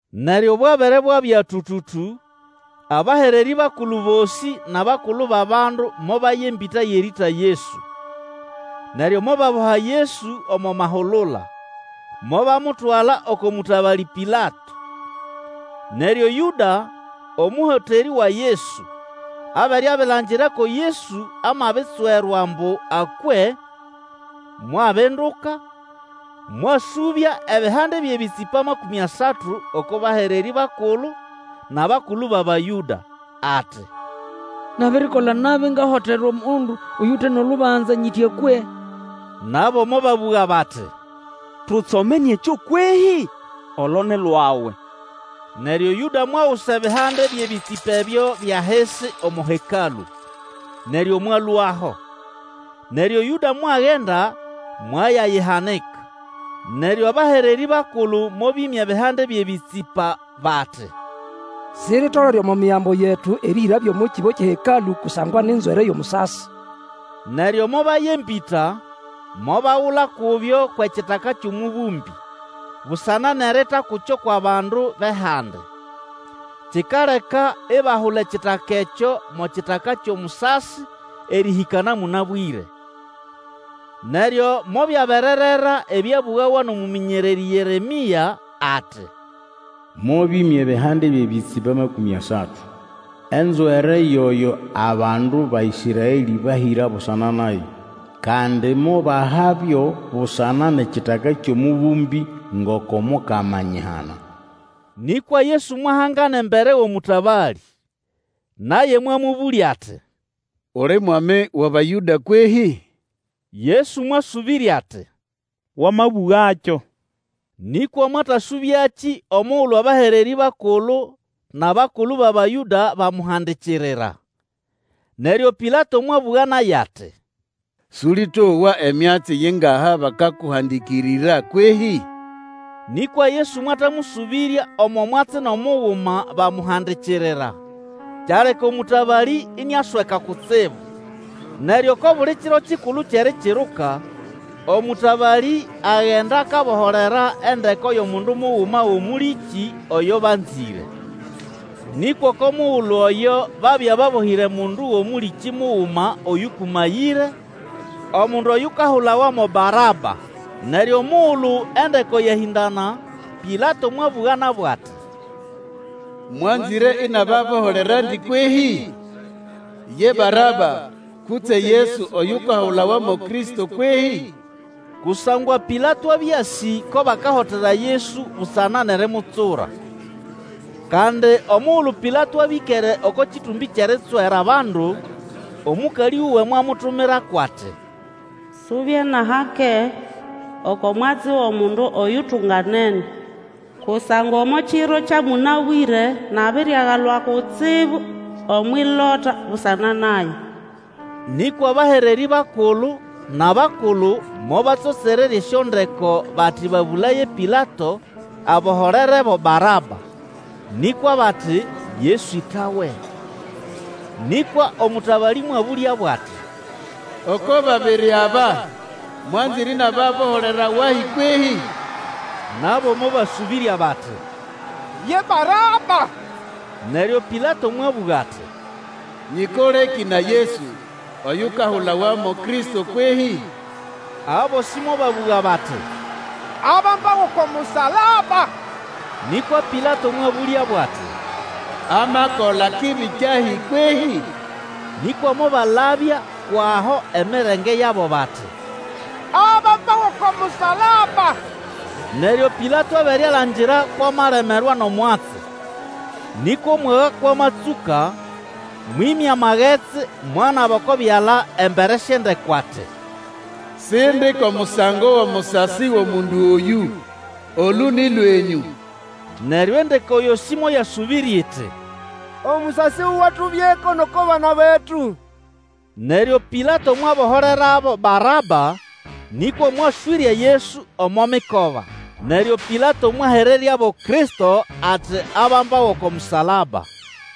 Neryo bwabere bwabya tũtũtũ, abahererĩ bakulu bosĩ nʼabakulu bʼabandu mobaya embĩta yʼerĩĩta Yesu. Neryo mobaboha Yesu omo mahulula, mobamutwala oko mũtabalĩ Pilato. Neryo Yũda, omũhoterĩ wa Yesu, abere abilangira ko Yesu amabitswerwa ambu akwe, mwabinduka, mwasũbya ebihande byʼebĩtsĩpa makũmĩ asatu oko bahererĩ bakulu nʼabakulu bʼAbayũda. Ati, Nabirikola nabi ngahotera omundu oyute nʼolubanza nyiti akwe. Nabo mobabũga bati, Tutsomene ekyo kwehĩ? Olo ni lwawe! Neryo Yũda mwagusa ebihande byʼebĩtsĩpa ebyo byʼahisi omo Hekalũ, neryo mwalũaho, Neryo Yũda mwagenda mwayayihanika. Neryo abahererĩ bakulu mobĩmya ebihande byʼebĩtsĩpa bati, Siritolere omo Migambo yetu erĩhĩrabyo omo kĩbo kyʼeHekalũ kusangwa ni nzwere yʼomusasi. Neryo mobaya embĩta, mobagula kubyo kwʼEkitaka kyʼomũbũmbĩ, busana nʼerita kukyo kwʼabandu bʼehandi. Kikaleka ibahula ekitaka ekyo mo Kitaka kyʼomusasi erĩhĩka na mũnabwĩre. Neryo mobyabererera ebyabũgawa nʼomũmĩnyererĩ Yeremĩa ati, Mobĩmya ebihande byʼebĩtsĩpa amakũmĩ asatu, enzwere yoyo abandu ba Ĩsraelĩ bahĩra busana naye. Kandi mobahabyo busana nʼEkitaka kyʼomũbũmbĩ, ngoko Mukama anyihana. Nĩkwa Yesu mwahangana embere wʼomũtabalĩ. Naye mwamũbũlya ati, Uli mwami wʼAbayũda kwehĩ? Yesu mwasũbĩrya ati, Wamabũgakyo. Nĩkwa mwatasũbyakĩ omugulu abahererĩ bakulu nʼabakulu bʼAbayũda bamuhandikirira. Neryo Pilato mwabũga naye ati, Sũlĩtowa emyatsi yingaha bakakuhandikirira kwehĩ? Nĩkwa Yesu mwatamũsũbĩrya omo mwatsi nʼomuguma bamuhandikirira, kyaleka omũtabalĩ iniasweka kutsibu. Neryo oko buli kiro kikulu kyʼErikiruka, omũtabalĩ agenda akaboholera endeko yʼomundu muguma wʼomũlĩkĩ oyo banzĩre. Nĩkwa oko mugulu oyo babya babohĩre mundu wʼomũlĩkĩ muguma oyũkũmayĩre, omundu oyukahulawa mo Baraba. Neryo omugulu endeko yahĩndana, Pilato mwabũga nabo ati, Mwanzĩre inababoholerandi kwehĩ? Ye Baraba, kutse Yesu oyukahulawa mo Kristo kwehĩ? Kusangwa Pilato abya asĩ ko bahotera Yesu busana nʼerimutsura. Kandi omugulu Pilato abya ĩkere oko kĩtũmbĩ kyʼeritswera bandu, omũkalĩ wuwe mwamutumako ati, Subye nʼahake oko mwatsi wʼomundu oyutunganene, kusangwa omo kiro kya mũnabwĩre nabiriagalwa kutsibu omwʼilota busana naye. Nĩkwa abahererĩ bakulu nʼabakulu mobatsotsererya esyondeko bati babũlaye Pilato aboholerebo Baraba, nĩkwa bati, Yesu ĩtawe. Nĩkwa omũtabalĩ mwabũlyabo ati, Oko babiri aba mwanzĩre inababoholera wahi kwehĩ? Nabo mobasũbĩrya bati, Ye Baraba. Neryo Pilato mwabũga ati, Nyĩkolekĩ na Yesu oyukahulawa mo Kristo kwehĩ? Abosĩ mobabũga bati, Abambawe oko musalaba! Nĩkwa Pilato mwabũlyabo ati, Amakola kibi kyahi kwehĩ? Nĩkwa mobalabya kwʼaho emirenge yabo, bati, Abambawe oko musalaba! Neryo Pilato abere alangira kwʼamalemerwa nʼomwatsi, nĩkwa omwaga kwʼamatsũka, mwĩmya amagetsi mwanaba oko byala embere syʼendeko ati, Sindi kʼomusango wʼomusasi wʼomundu oyũ! Olũ nĩ lwenyũ! Neryo endeko yosĩ moyasũbĩrya iti, Omusasi wuwe atubyeko nʼoko bana betu! Neryo Pilato mwaboholerabo Baraba, nĩkwa mwaswĩrya Yesu omo mikoba, neryo Pilato mwahereryabo Kristo ati abambawe oko musalaba.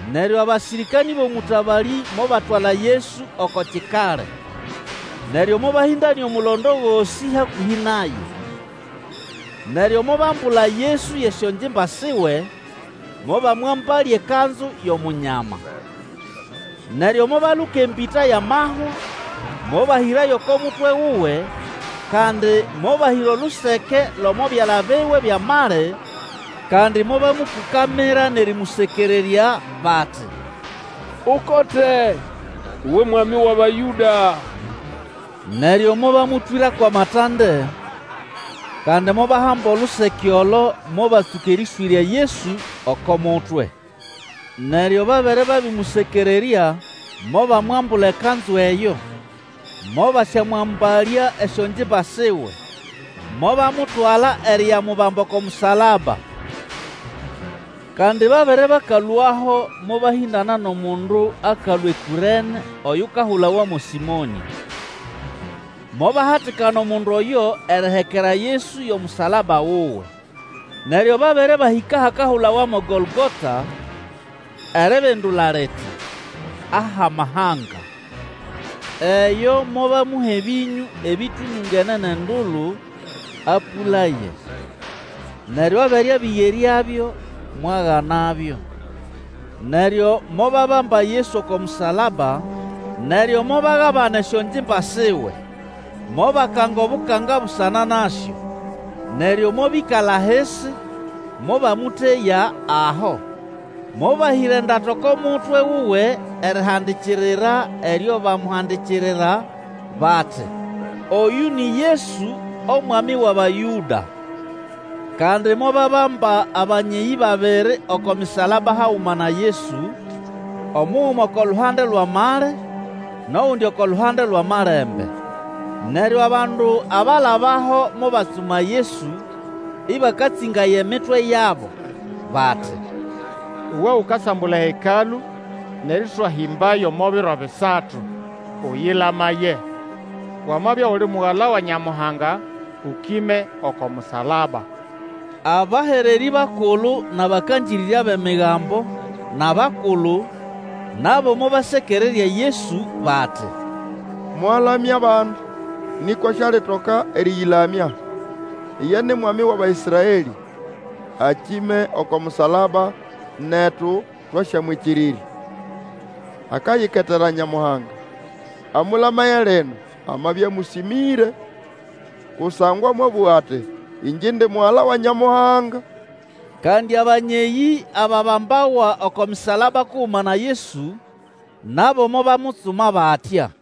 Neryo abasĩrĩkanĩ bʼomũtabalĩ mobatwala Yesu oko Kikali, neryo mobahĩndanĩa omulondo gosĩ hakũhĩ naye. Neryo mobambula Yesu yʼesyongimba siwe, mobamwambalya ekanzu yʼOmunyama. Neryo mobaluka embĩta yʼamahwa, mobahĩrayo oko mutwe wuwe, kandi mobahĩra oluseke lʼomo byala biwe byʼamali, kandi mobamũkũkamira nʼerĩmũsekererya, bati, Ukote, uwe Mwami wʼAbayũda! Neryo mobamũtwĩra kwʼamatande, kandi mobahamba oluseke olo mobatsũka erĩswĩrya Yesu oko mutwe. Neryo babere babĩmũsekererya, mobamwambula ekanzu eyo, mobasyamwambalya esyongimba siwe, mobamutwala eriyamubamba oko musalaba. Kandi babere bakalũaho mobahĩndana nʼomundu akalũa eKũrene oyukahulawa mo Sĩmonĩ. Mobahatikana omundu oyo erihekera Yesu yʼomusalaba wuwe. Neryo babere bahĩka ahakahulawa mo Gologota, eribindula liti, Ahʼamahanga; eyo mobamuha ebĩnyũ ebĩtũlũngene nʼendulu, apũlaye, neryo abere abĩgeryabyo, mwaganabyo. Neryo mobabamba Yesu oko musalaba, neryo mobagabana esyongimba siwe, mobakanga obukanga busana nasyo. Neryo mobĩkala ahisi, mobamũteya aho. Mobahĩra endata oko mutwe wuwe erihandikirira eryo bamuhandikirira, bati, OYŨ NI YESU OMWAMI WʼABAYŨDA. Kandi mobabamba abanyeyĩ babiri oko misalaba haguma na Yesu, omuguma oko luhande lwʼamali, nʼogundi oko luhande lwʼamalembe. Neryo abandu abalabaho mobatsuma Yesu, ĩbakatsĩngaya emitwe yabo, bati, Uwe ukasambula eHekalũ nʼerĩswahĩmbayo omo biro bisatu, ũyĩlamaye! Wamabya uli Mugala wa Nyamuhanga, ũkĩme oko musalaba! Abahererĩ bakulu nʼabakangĩrĩrya bʼEmigambo nʼabakulu, nabo mobasekererya Yesu bati, Mwalamya abandi, nĩkwa sialitoka erĩyĩlamya! Iye ni Mwami wʼAbaĩsraelĩ, akĩme oko musalaba, netu twasyamwĩkĩrĩrya! Akayiketera Nyamuhanga, amũlamaye lino, amabya amũsĩmĩre. Kusangwa mwabũga ati, Ĩngye indi Mugala wa Nyamuhanga. Kandi abanyeyĩ ababambawa oko misalaba kuguma na Yesu, nabo mobamutsuma batya.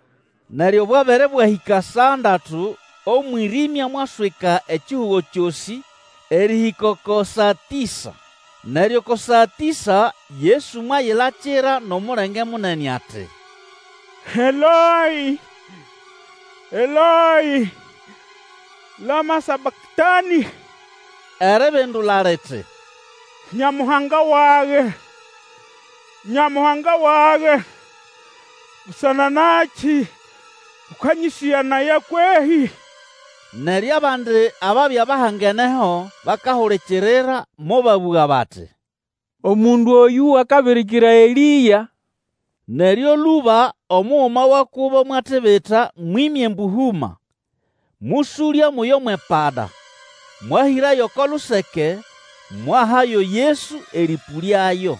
Neryo bwabere bwahĩka saa ndatu omwĩrĩmya mwaswika ekihugo kyosĩ, erĩhĩka oko saa tĩsa. Neryo oko saa tĩsa Yesu mwayilakira nʼomulenge munene ati, Eloĩ, Eloĩ, lama sabaktanĩ? Eribindula liti, Nyamuhanga wage, Nyamuhanga wage, busana nakĩ ũkanyĩsĩganaya kwehĩ? Neryo abandi ababya bahangeneho bakahulikirira, mobabũga bati, Omundu oyũ akabirikira Elĩa. Neryo lũba omuguma wa kubo mwatibita mwĩmya embũhũma, mũsũlya muyo mwʼepada, mwahĩrayo oko luseke, mwahayo Yesu erĩpũlyayo.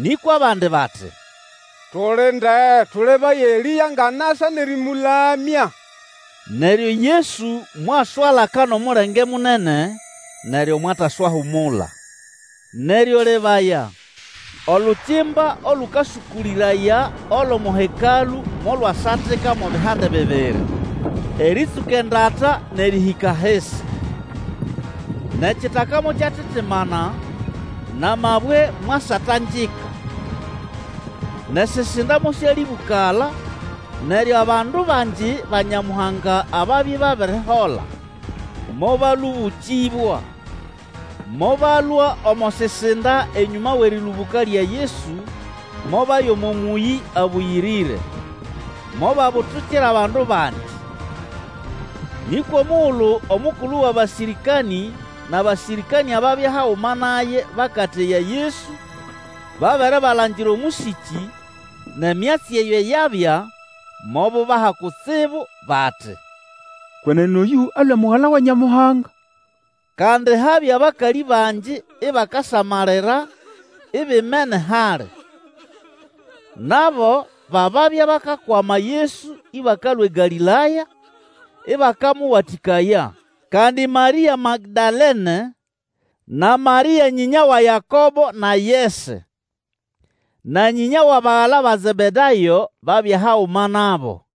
Nĩkwa abandi bati, Tulinde, tũlebaye Elĩa ngʼanasa nʼerĩmũlamya. Neryo Yesu mwaswalaka nʼomulenge munene, neryo mwataswahumula. Neryo lebaya, olukimba olũkasũkũlĩraya olʼomo Hekalũ molwasatika mo bihande bibiri, erĩtsũka endata nʼerĩhĩka ahisi. Nʼekitaka mokyatitimana, nʼamabwe mwasatangika. Nʼesisinda mosyalĩbũkala, neryo abandu bangi ba Nyamuhanga ababya ibabirihola, mobalũbũkĩbwa. Mobalũa omo sisinda enyũma wʼerĩlũbũka lya Yesu, mobaya omo mũyĩ abũyĩrĩre, mobabutukira abandu bangi. Nĩkwa omugulu omukulu wʼabasĩrĩkanĩ nʼabasĩrĩkanĩ ababya haguma naye bakateya Yesu, babere balangira omũsĩkĩ, nʼemyatsi eyo yabya, mobubaha kutsibu bati, Kwenene oyũ alũe Mugala wa Nyamuhanga! Kandi habya bakalĩ bangi ibakasamalira ibimene hali. Nabo ba babya bakakwama Yesu ĩbakalũa eGalĩlaya, ĩbakamũwatĩkaya. Kandi Marĩa Magdalene, na Marĩa nyĩnya wa Yakobo na Yese, na nyĩnya wʼabagala ba Zebedayo babya haguma nabo.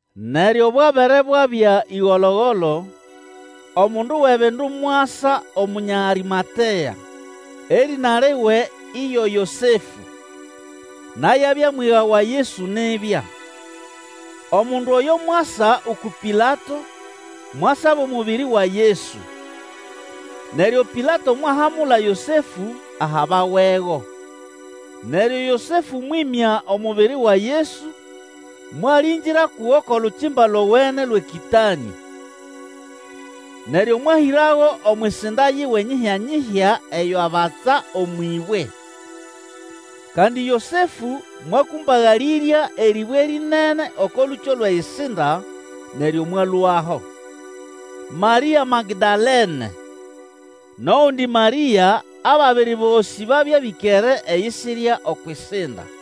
Neryo bwabere bwabya ĩgolo-golo, omundu wʼebindu mwasa Omunya Arĩmatea, erĩna liwe iyo Yosefũ, naye abya mwiga wa Yesu nibya. Omundu oyo mwasa uku Pilato, mwasaba omubiri wa Yesu. Neryo Pilato mwahamula Yosefũ ahabawego. Neryo Yosefũ mwĩmya omubiri wa Yesu, mwalĩngĩra kugo kʼolukimba lowene lwʼekĩtanĩ. Neryo mwahĩrago omwʼisinda yiwe nyihyanyihya eyo abatsa omwʼĩbwe. Kandi Yosefũ mwakũmbagalĩrya erĩbwe rĩnene oko lũkyo lwʼeyisinda, neryo mwalũaho. Marĩa Magdalene, nʼogundi Marĩa ababiri bosĩ babya bĩkere eyisirya okwʼisinda.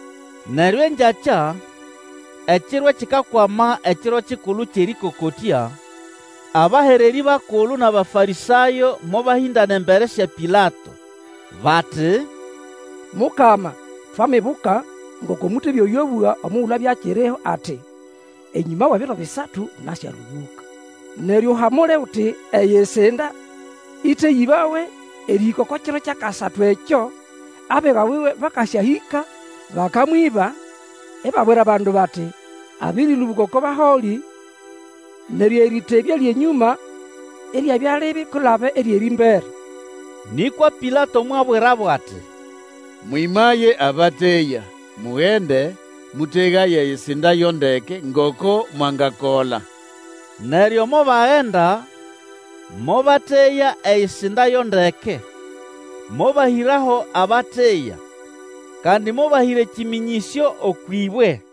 Neryo engyakya, ekiro ekikakwama ekiro kikulu kyʼErĩkokotya, abahererĩ bakulu nʼAbafarĩsayo mobahĩndana embere sya Pilato, bati, Mukama twamibuka ngoko mũtebya oyo abũga omugulu abya akiriho ati, Enyũma wʼebiro bisatu nasyalũbũka. Neryo, uhamule uti eyisinda ĩteyĩbawe erĩhĩka oko kiro kyʼakasatu ekyo, abiga buwe bakasyahĩka, bakamwĩba, ibabwira bandu bati, Abĩrĩlũbũka oko baholĩ, neryo, erĩtebya lyʼenyũma iryabya libi kwilaba eryʼerĩmbere. Nĩkwa Pilato mwabwirabo ati, Mwĩmaye abateya, mugende, mũtegaye eyisinda yo ndeke ngoko mwangakola. Neryo mobagenda, mobateya eyisinda yo ndeke, mobahĩraho abateya, kandi mobahĩra ekĩmĩnyĩsyo okwʼĩbwe.